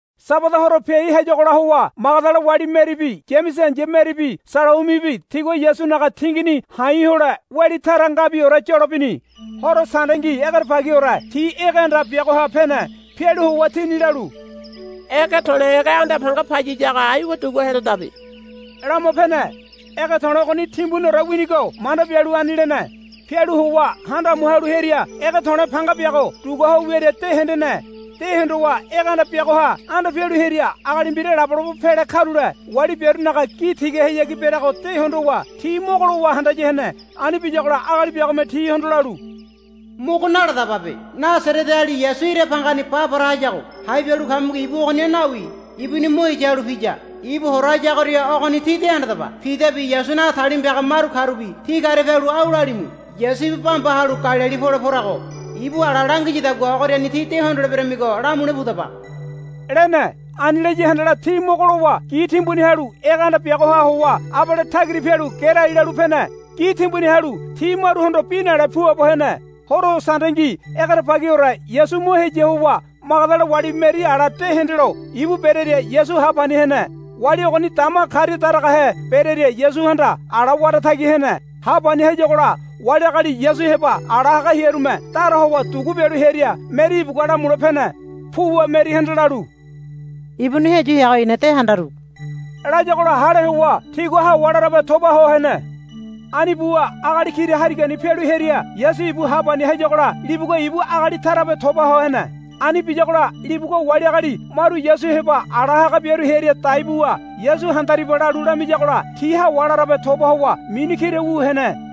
Sabada horo piai hayagola howa Magadala wali Meribi Yamese ai̱ya Meribi Salaumibi tigua Yasunaga tinginini ha̱i̱ hole weli tara ngabiore yolo bini. Horo Sandengi egerebagiore ti ege anda biagoha pene. Pialu howa tini lalu, Ege to̱le̱ ege anda panga payiyago aiwa dugua helodabe, lama pene. Ege to̱le̱ ogoni timbuniore winigo manda bialu ani lene. Pialu howa handa amu halu hearia ege to̱le̱ panga biago dugua ho wiaria de hendene. De hondowa ege anda biagoha anda pialu hearia agali mbira labolabo pele karule wali biarunaga gi tigahayagi bereago de hondowa ti mogo lowa handaya hene. Ani biyagola agali biagome tihondo lalu, Mogo naladababe. Nasareteali Yasu ira bangani ba para hayago hai bialu kamigo ibu ogoniha nawi ibuni mo heya halu piya. Ibu hora hayagoria ogoni tí de handadaba. Pidabi Yasunaga talima piaga maru karubi ti karia pialu au lalimu. Yasu ibu bambaha halu Galili pole porago. Ibu ala langiyadagua ogoriani tí de hondoleberemigo, lamule pudaba, lene. Ani laya handala ti mogo lowa gi timbuni halu ege anda biagoha howa abale tagira pialu gerai lalu pene. Gi timbuni halu ti maruhondo bi nale puabo hene. [ Horo Sandengi egerebagiore Yasu mo heya howa Magadala wali Meri ala de hendelo ibu bereria Yasu ha pani hene. Wali ogoni dama karia daragahe berearia Yasuhanda ala wara tagi hene. Ha pani hayagola wali agali Yasu heba ala haga hearume dara howa dugu bialu hearia Meri ibugua lamule pene. Puwa Merihanda lalu, Ibuni heyu heago i̱na de handaru, layagola hale howa tigua hawa larabe toba ho hene. Ani buwa agali kira harigani pialu hearia Yasu ibu ha pani hayagola libugua ibu agali tarabe toba ho hene. Ani biyagola libugua wali agali maru Yasu heba ala haga biaru hearia dai buwa, Yasu handariba, lalu lamiyagola ti hawa larabe toba howa mini kira wu hene.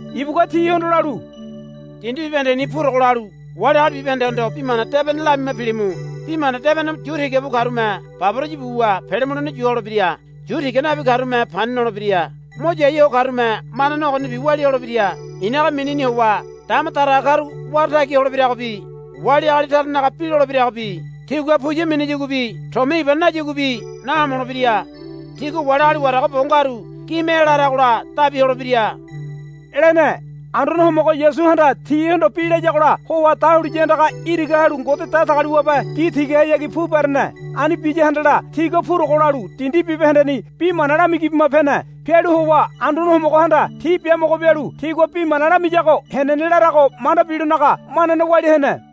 Ibugua tihondo lalu, Dindi bibahendeni purogo lalu wali agali bibahendehondo bi mana debene lamima pilimu. Bi mana debene yu tiga bu karume baboraya buwa pele mulene yu holebira. Yu tiga nabi karume pani nolebira. Mo yai ho karume manane ogonibi walia holebira. I̱naga minini howa dama daraga karu wara tagi holebiragobi wali agali taranaga bi lolebiragobi tigua puya minayaguabi tomia iba nayaguabi nahomolebira. Tigua wali agali warago bo ngaru gime ela haragola dabi holebira, lene. Anduane Homogo Yasuhanda tihondo bi layagola howa dahuliya andaga iraga halu Ngode Datagaliwabe gi tigahayagi pu berene. Ani biya handala tigua purogo lalu dindi bibahendeni bi mana lamigi bima pene. Pialu howa Anduane Homogohanda ti biamogo bialu tigua bi mana lamiyago henene larago manda bilonaga manane walia hene.]